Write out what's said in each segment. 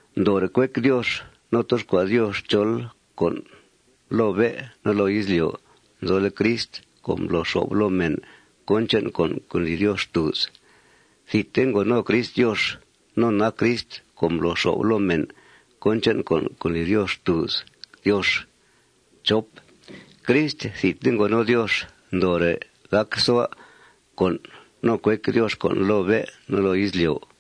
Ndoore' cuec Diox no toxcua' Diox chol con' loo bé' no loo izlyo' nzole' Crist co' mblo xo'f loo mèn cón che'n con' co' ndli Diox xtùuz. Thidte ngo no Crist Diox. No nac Crist co' mblo xo'f loo mèn cón che'n con' co' ndli Diox xtùuz Diox. Crist thidte ngo no Diox ndoore' gacsua' con' no cuec Diox con' loo bé' no loo izlyo'.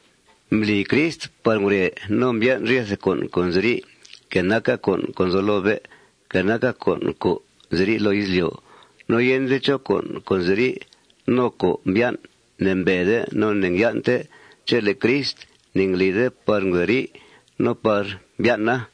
Mbli Crist par ngure no mbyan' ryethe con' co' nziri', que naca con' co' nzo loo bé', que naca con' co' nziri' loo izlyo'. No yende chó con' co' nziri' no co' mbyan' ne'mbede no ne'ngyan'te chele' Crist ne'nglide par ngurei no par mbyan'a.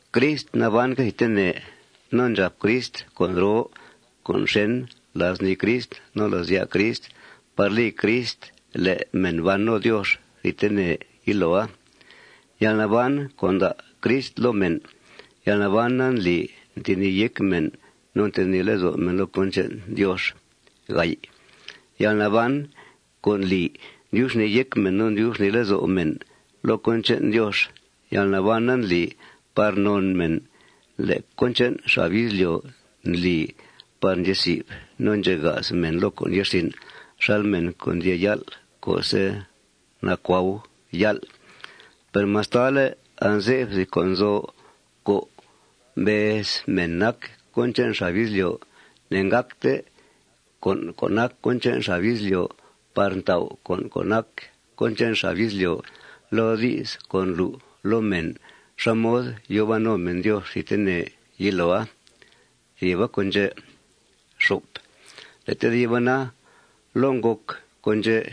Crist nabanque' thidtene. No ndxàp Crist con' roo con' xèn la's nii Crist no la's ya' Crist par li Crist le' mèn ban no Diox thidtene yiloa. Yalnaban co' nda' Crist loo mèn, yalnabana ndli ntenìi yéc mèn no ntenìi lezo' mèn loo cón che'n Diox. Yalnaban co' ndli ndyub xnìi yéc mèn no ndyub xnìi lezo' mèn loo cón che'n Diox, yalnabana ndli par non mèn le' cón che'n xab izlyo' ndli par ndxezi'f no ndxega's mèn loo con' ye'rsin' xal mèn co' ndyee yál' co'se' nacuau yál'. Per mastale' anze'f thìb con' nzo co' mbez mèn nac con che'n xab izlyo', ne'ngácte con' co' nac cón che'n xab izlyo' par tau' con' co' nac cón che'n xab izlyo' loo di's co' ndlu' loo mèn xá mod yòo ban no mèn Diox thidtene yiloa. Thìba con' ndxè'. Le' tediba na, loo ngòc con' ndxè'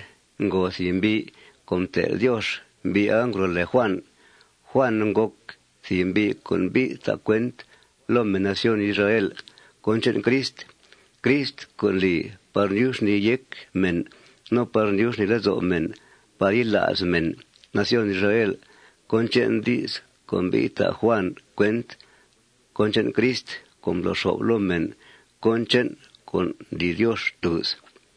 ngo thìb mbi' co' mtel' Diox. Mbi'a ngro' lèe Juàn. Juàn ngòc thìb mbi' co' mbi'th ta' cuent loo mèn nación Israel cón che'n Crist, Crist co' mbli par mdyub xnìi yéc mèn no par mdyub xnìi lezo' mèn par yila's mèn nación Israel cón che'n di's co' mbi'th ta' Juàn cuent cón che'n Crist co' mblo xo'f loo mèn cón che'n con' ndli Diox xtùuz.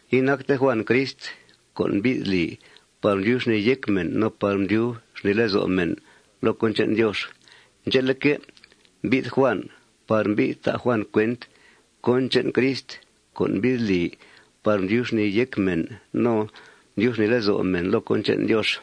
Inacte Juàn Crist co' mbi'th li par mdyub xnìi yéc mèn no par mdyub xnìi lezo' mèn loo cón che'n Diox. Ndxe'leque', mbi'th Juàn par mbi'th ta' Juàn cuent cón che'n Crist co' mbi'th li par mdyub xnìi yéc mèn no mdyub xnìi lezo' mèn loo cón che'n Diox.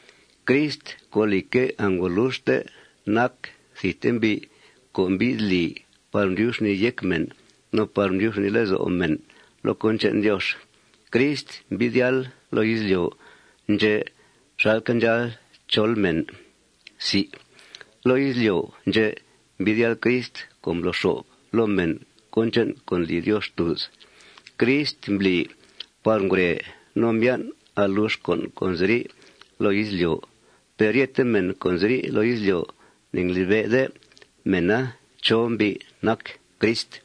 Crist co', lìcque', angoluxte nac thidte mbi' co' mbi'th li par tyub xnìi yéc mèn no par tyub xnìi lezo' mèn loo cón che'n Diox, Crist mbi'th yáal loo izlyo' ndxè' xalque' ndxáal chol mèn. Loo izlyo' ndxè' mbi'th yáal Crist co' mblo xo'f loo mèn cón che'n con' ndli Diox xtùuz. Crist mbli par ngure no mbyan' alux con' co' nziri' loo izlyo'. Per ryethe mèn co' nziri' loo izlyo', ne'nglibe'de mèna chó mbi' nac Crist.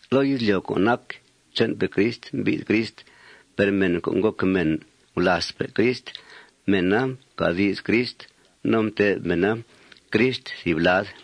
Loo izlyo' co' nac che'npe' Crist mbi'th Crist. Per mèn co' ngòc mèn gulàazpe' Crist, mèna mcà di's Crist. No mtè'f mèna Crist thìb lad.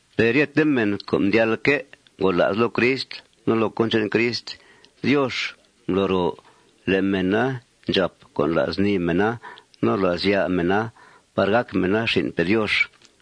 Per ryete mèn co' mdyalque' ngola's loo Crist no loo cón che'n Crist, Diox mblo ro le' mèna ndxàp con' la's nii mèna no la's ya' mèna par gàc mèna xin'pe' Diox.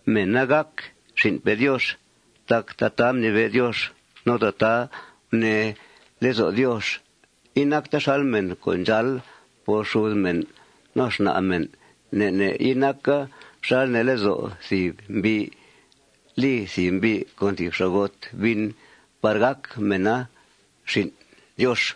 Mèna gàc xin'pe' Diox tac tataa mnibe' Diox no tataa gunee lezo' Diox. Inacta xal mèn co' ndxáal por xud mèn no xna' mèn. Ne' ne' inaca xal nee lezo' thìb mbi' li thìb mbi' con thìb xa'got bin par gàc mèna xin' Diox.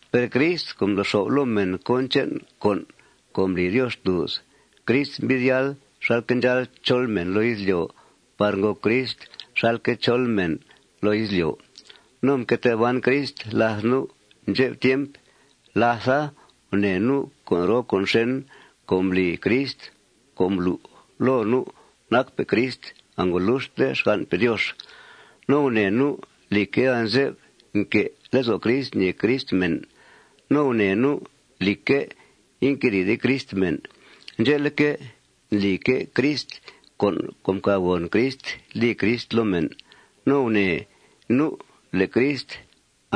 Per Crist co' mblo xo'f loo mèn cón che'n con' co' ndli Diox xtùuz, Crist mbi'th yáal xalque' ndxáal chol mèn loo izlyo' par ngòc Crist xalque' chol mèn loo izlyo'. No mque tee ban Crist làth nu' ndxep tiemp. Látha, gunèe nu' con' roo con' xèn co' mbli Crist co' mblu' loo nu' nacpe' Crist angoluxte xgan'pe' Diox. No gunèe nu', lìcque', anze'f nque' lezo' Crist ñèe Crist mèn. No gunèe nu', lìcque', inquedìide Crist mèn. Ndxe'leque', ndlique' Crist con' co' mcàbgòn Crist li Crist loo mèn. No gunèe nu' le' Crist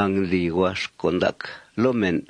angndli huax con' ndac loo mèn.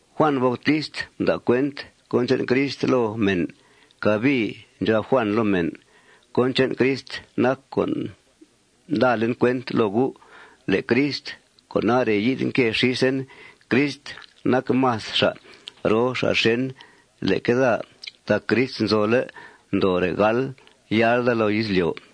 Juàn Bautist mda' cuent cón che'n Crist loo mèn. Cabii ndxab Juàn loo mèn: ―Cón che'n Crist nac co' mdalen cuent loo gu' le' Crist co' nare' yi'th nque xísen, Crist nac más xa' roo xa' xèn leque daa tac Crist nzole' ndoore' gal yáal daa loo izlyo'.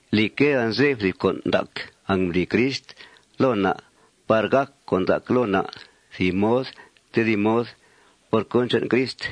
Lìcque', anze'f thìb con' ndac angmbli Crist loo na' par gàc con' ndac loo na' thìb mod tedib mod por cón che'n Crist.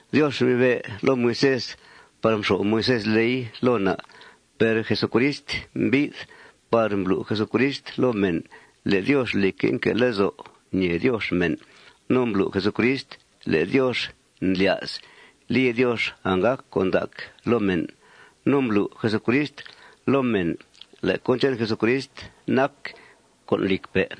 Diox mnibe' loo Moisés par mxo'f Moisés ley loo na'. Per Jesucrist mbi'th par mblu' Jesucrist loo mèn le' Diox, lìcque', nque' lezo' ñèe Diox mèn. No mblu' Jesucrist le' Diox ndlya's li Diox anggàc con' ndac loo mèn. No mblu' Jesucrist loo mèn le' cón che'n Jesucrist nac con' lìcpe'.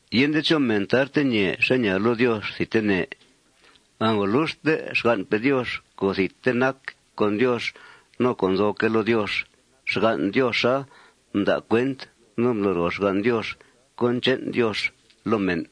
Yende chó mèn tarte ñèe xá ñaa loo Diox thidtene. Angoluxte xgan'pe' Diox co' thidte nac con Diox no co' nzoque' loo Diox, xgan' Dioxa mda' cuent no mblo ro xgan' Diox cón che'n Diox loo mèn.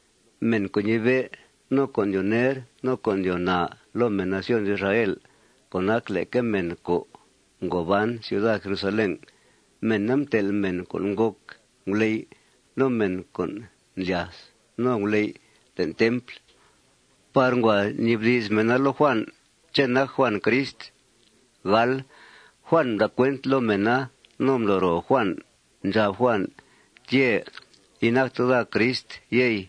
Mèn co' ñibe', no co' ndyoo ner, no co' ndyoo naa loo mèn nación Israel, co' nac leque mèn co' ngo ban ciuda Jerusalén, mèna mtel' mèn co' ngòc nguley' no mèn co' ndlyath no nguley' le'n templ par ngua nibdi's mèna loo Juàn ché' nac Juàn Crist. Juàn mda' cuent loo mèna no mblo ro Juàn. Ndxab Juàn: ―Tyè'. Inacte daa Crist, yey.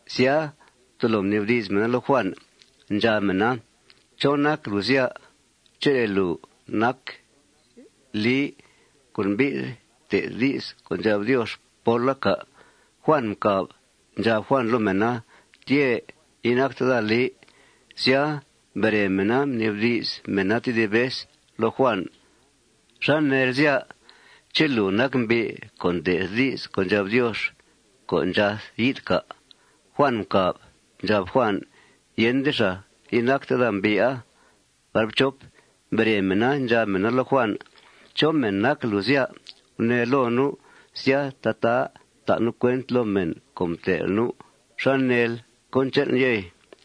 Sya, tolo mnibdi's mèna loo Juàn. Ndxab mèna: ―¿Chó nac lùu, sya? ¿Ché' lùu nac Lii co' mbi'th te'th di's co' ndxab Diox póla, cà'? Juàn mcàb. Ndxab Juàn loo mèna: ―Tyè'. Inacte daa Lii. Sya, mbere mèna, mnibdi's mèna tedib vez loo Juàn: ―¿Xá neel, sya? ¿Ché' lùu nac mbi' co' te'th di's co' ndxab Diox co' ndxath yi'th, cà'? Juàn mcàb. Ndxab Juàn: ―Yende xàa. Inacte daa mbi'a. Mbere mèna, ndxab mèna loo Juàn: ―¿Chó mèn nac lùu, sya? Gunee loo nu'. Sya, tataa ta' nu' cuent loo mèn co' mtel' nu'. ¿Xá neel cón che'nl, yey?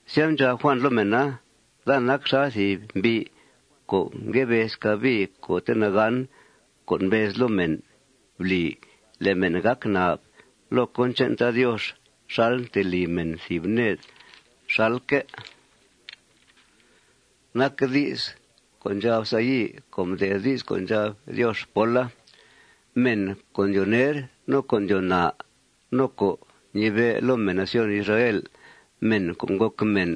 Sya, ndxab Juàn loo mèna: ―Daa nac xal thìb mbi' co' ngue bez cabii co'te' nagán co' mbez loo mèn: Bli le' mèn gàc nab loo cón che'n Tad Diox xal ntelì mèn thìb ned xalque' nac di's co' ndxab Sayi' co' mde'th di's co' ndxab Diox póla. Mèn co' ndyoo ner, no co' ndyoo naa, no co' ñibe' loo mèn nación Israel, mèn co' ngòc mèn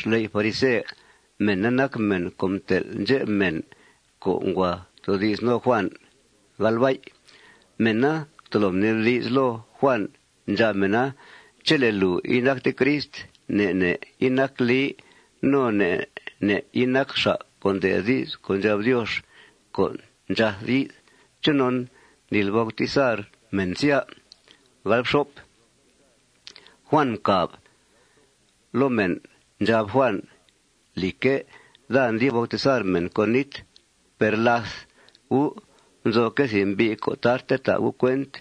xley' farise, mèna nac mèn co' mtel' ndxep mèn co' ngua toodi's no Juàn. Mèna tolo mnibdi's loo Juàn. Ndxab mèna: ―Chele' lùu inacte Crist, ne' ne' inacl Lii, no ne' ne' inacl xa' co' te'th di's co' ndxab Diox co' ndxath yi'th, ¿chonon ndlil bautizar mèn, sya? Sya, mcàb Juàn loo mèna. Ndxab Juàn: ―Lìcque', daa ndli bautizar mèn con nít. Per làth gu' nzoque' thìb mbi' co' tarte ta' gu' cuent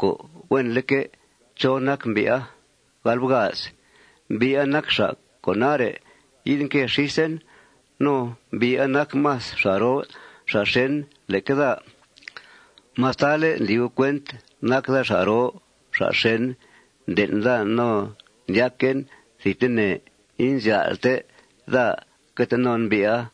co' huenleque' chó nac mbi'a. Mbi'a nac xa' co' nare' yi'th nque xísen. No mbi'a nac más xa' roo xa' xèn leque daa. Mastale' ndli gu' cuent nac daa xa' roo xa' xèn, nden' daa no ndyaquen thidtene inzyál'te daa que tee non mbi'a.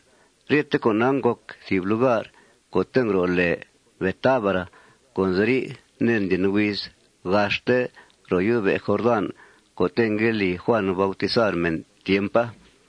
Ryete con'a ngòc thìb lugar co' ngro' lèe Betábara co' nziri' ned ndlyen huiz gaxte ro yó'be' Jordán co'te' ngue li Juàn bautizar mèn tiempa.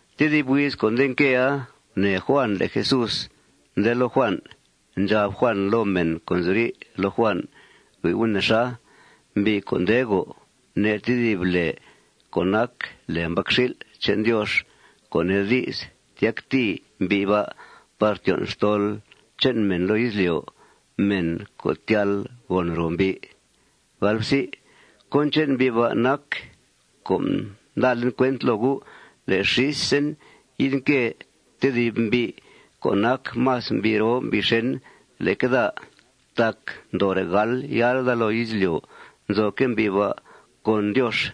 Tedib huiz co' nde nquea, gunèe Juàn le' Jesús nde loo Juàn. Ndxab Juàn loo mèn co' nziri' loo Juàn: ―Hui' gu' nexa. Mbi' co' nde go' ne' tedib lèe co' nac lèe Mbacxil' che'n Diox, co' nee di's, tyactìi mbi' ba' par tyon' xtol che'n mèn loo izlyo', mèn co' tyal gòn ro mbi'. Cón che'n mbi' ba' nac co' mdalen cuent loo gu' le' xísen yi'th nque tedib mbi' co' nac más mbi' roo mbi' xèn leque daa. Tac ndoore' gal yáal daa loo izlyo' nzoque' mbi' ba' con Diox.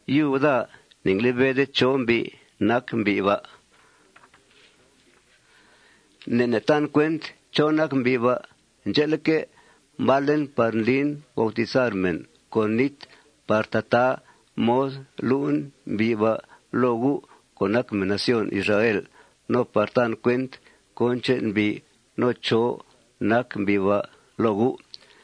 Yub daa ne'nglibe'de chó mbi' nac mbi' ba'. Ne' ne' tan cuent chó nac mbi' ba'. Ndxe'leque', mbalen par ndlin bautizar mèn con nít par tataa mod lu'en mbi' ba' loo gu' co' nac mèn nación Israel no par tan cuent cón che'n mbi' no chó nac mbi' ba' loo gu'.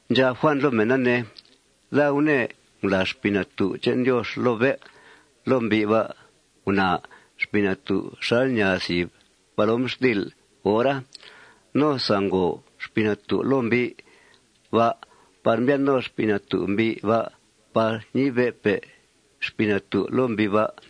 Ndxab Juàn loo mèna, ne: ―Daa gunèe ngulàa Xpii Natú' che'n Diox loo bé' loo mbi' ba'. Gunaa Xpii Natú'a xal ñaa thìb palomxtil' hora. No sangngòo Xpii Natú' loo mbi' ba' par mbyan' no Xpii Natú' mbi' ba' par ñibe'pe' Xpii Natú' loo mbi' ba'.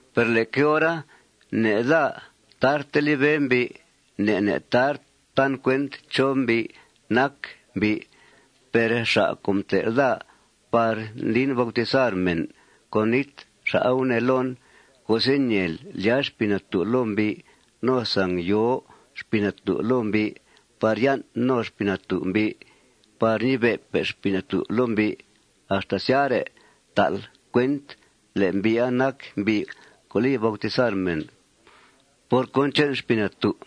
Per leque hora ne' daa tarte libe' mbi'. Ne' ne' tar tan cuent chó mbi' nac mbi'. Per xa' co' mtel' daa par ndlin bautizar mèn con nít, xa'a gunee loon: ―Co'se' ñèel lyàa Xpii Natú' loo mbi' no sangyòo Xpii Natú' loo mbi' par yan' no Xpii Natú' mbi' par ñibe'pe' Xpii Natú' loo mbi', axta syare' ta'l cuent le' mbi'a nac mbi' co' li bautizar mèn por cón che'n Xpii Natú'.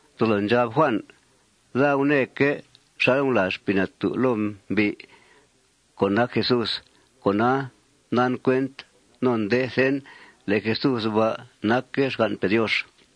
Tolo ndxab Juàn: ―Daa gunèeque' xal ngulàa Xpii Natú' loo mbi' co' nac Jesús. Cona, ndan cuent no ndethen le' Jesús ba' nacque' xgan'pe' Diox.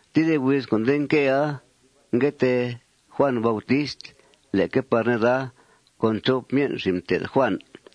Tedib huiz co' nde nquea, ngue tee Juàn Bautist leque par neda con chop myen' xin' mté'th Juàn.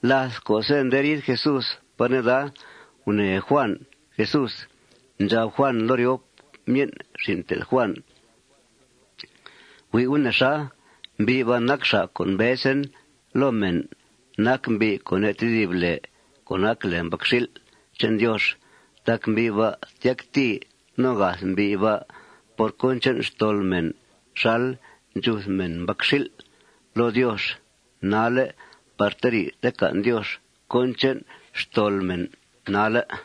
Láth co'se' nde riid Jesús par neda, gunèe Juàn Jesús. Ndxab Juàn loo ryop myen' xin' mté'th Juàn: ―Hui' gu' nexa. Mbi' ba' nac xa' co' mbezen loo mèn nac mbi' co' ne' tedib lèe co' nac lèe Mbacxil' che'n Diox. Tac mbi' ba' tyactìi no gath mbi' ba' por cón che'n xtol mèn xal ndxuth mèn mbacxil' loo Diox nalle' par teri'th tecan' Diox cón che'n xtol mèn nalle'.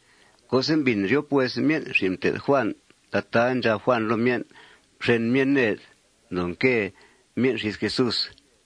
Co'se' mbìn ryop myen' xin' mté'th Juàn tataa ndxab Juàn loo myen', mxen myen' ned. Mdoo nque myen' xís Jesús.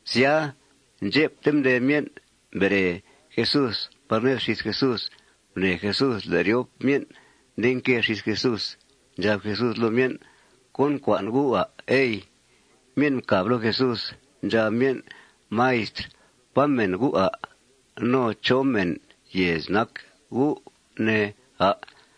Sya, ndxepte mdee myen', mbere Jesús par ned xís Jesús. Gunèe Jesús le' ryop myen' nde nque xís Jesús. Ndxab Jesús loo myen': ―¿Cón ncua'n gu', à', ey? Myen' mcàb loo Jesús. Ndxab myen': ―Maistr, ¿pá mèn U', à'? No ¿chó mèn yèez nac U', ne, à'?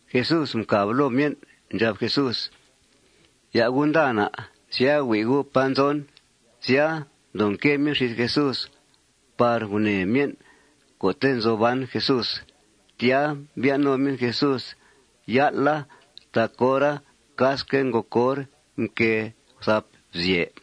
Jesús mcàb loo myen'. Ndxab Jesús: ―Ya' gu' nda na'. Sya, hui' gu' pá nzon. Sya, mdoo nque myen' xís Jesús par gunèe myen' co'te' nzo ban Jesús. Tya, mbyan' no myen' Jesús yál'a tac hora casque' ngòc hor nquée guthap bzyè.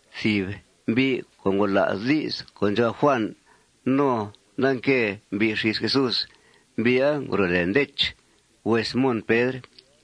Thìb mbi' co' ngola's di's co' ndxab Juàn no nda nque mbi' xís Jesús, mbi'a ngro' lèe Ndech, hues Mon Pedr.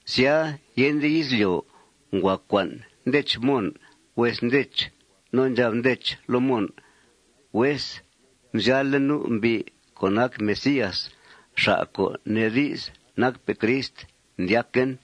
Sya, yende izlyo', ngua cua'n Ndech Mon, hues Ndech. No ndxab Ndech loo Mon: ―Hues, mzyál'le' nu' mbi' co' nac Mesías, xa' co' nee di's nacpe' Crist, ndyaquen.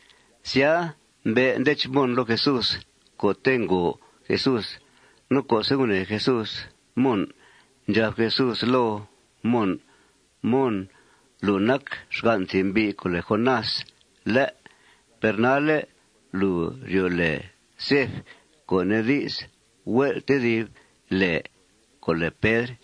Sya, mbe' Ndech Mon loo Jesús co'te' ngo Jesús. No co'se' gunèe Jesús Mon, ndxab Jesús loo Mon: ―Mon, lùu nac xgan' thìb mbi' co' lèe Jonás, ¿lé'? Per nalle' lùu ryo' lèe Cef, co' nee di's, hue'l tedib lèe co' lèe Pedr.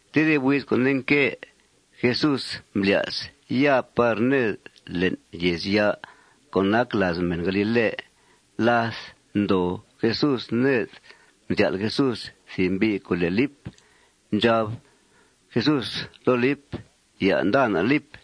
Tedib huiz co' nde nque, Jesús mblya's ya par ned le'n yèezya' co' nac làaz mèn galile. Láth ndoo Jesús ned, mzyál' Jesús thìb mbi' co' lèe Lip. Ndxab Jesús loo Lip: ―Ya' nda na', Lip.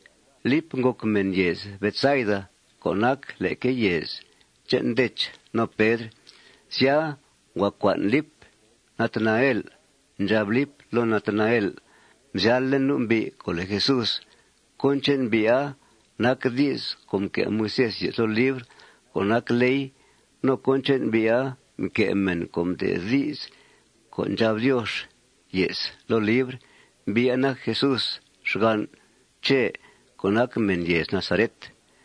Lipa ngòc mèn yèez Betsaid co' nac leque yèez che'n Ndech no Pedr. Sya, ngua cua'n Lip Natanael. Ndxab Lip loo Natanael: ―Mzyál'le' nu' mbi' co' lèe Jesús. Cón che'n mbi'a nac di's co' mque' Moisés ye's loo libr co' nac ley. No cón che'n mbi'a mque' mèn co' mde'th di's co' ndxab Diox ye's loo libr. Mbi'a nac Jesús, xgan' Chè, co' nac mèn yèez Nazaret.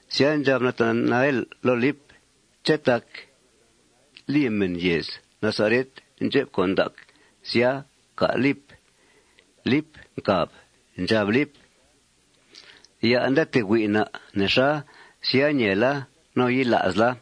Sya, ndxab Natanael loo Lip: ―¿Ché' tác li mèn yèez Nazaret ndxep con' ndac, sya, cà', Lip? Lip mcàb. Ndxab Lip: ―Ya' nda tee hui' na', nexa. Sya, ñeela no yila'sla.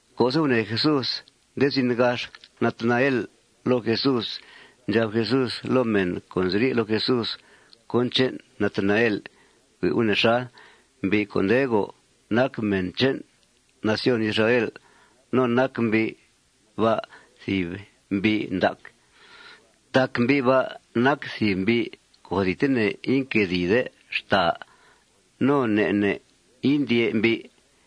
Co'se' gunèe Jesús nde zin gax Natanael loo Jesús, ndxab Jesús loo mèn co' nziri' loo Jesús cón che'n Natanael: ―Hui' gu' nexa. Mbi' co' nde go' nac mèn che'n nación Israel. No nac mbi' ba' thìb mbi' ndac. Tac mbi' ba' nac thìb mbi' co' thidtene inquedìide xtàa. No ne' ne' indyè' mbi'.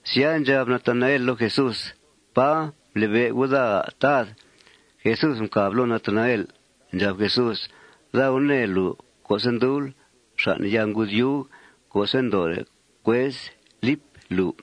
Sya, ndxab Natanael loo Jesús: ―¿Pá mblibe' U' daa, à', Tad? Jesús mcàb loo Natanael. Ndxab Jesús: ―Daa gunèe lùu co'se' ndubl xàn' yaa ngudyuug co'se' ndoore' cuez Lip lùu.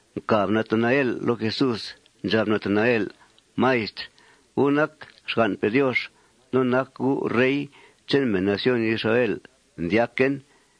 Mcàb Natanael loo Jesús. Ndxab Natanael: ―Maistr, U' nac xgan'pe' Diox. No nac U' rey che'n mèn nación Israel, ndyaquen.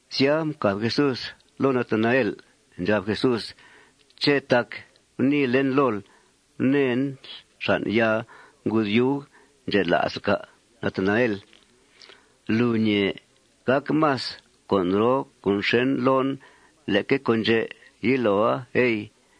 Sya, mcàb Jesús loo Natanael. Ndxab Jesús: ―¿Ché' tac guniilen lool gunèenl xàn' yaa ngudyuuga ndxela'sl, cà', Natanael? Lùu ñèe gàc más con' roo con' xèn loon leque con' ndxè' yiloa, ey.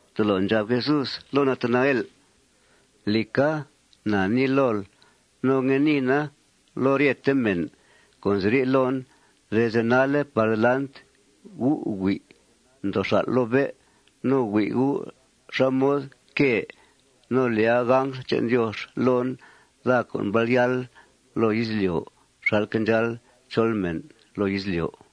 Tolo ndxab Jesús loo Natanael: ―Lìca, na nii lool, no ngue niina loo ryete mèn co' nziri' loon: Desde nalle' par delant, gu' hui' ndoo xal' loo bé'. No hui' gu' xá mod quée no lyàa angl che'n Diox loon, daa co' mbal yáal loo izlyo' xalque' ndxáal chol mèn loo izlyo'.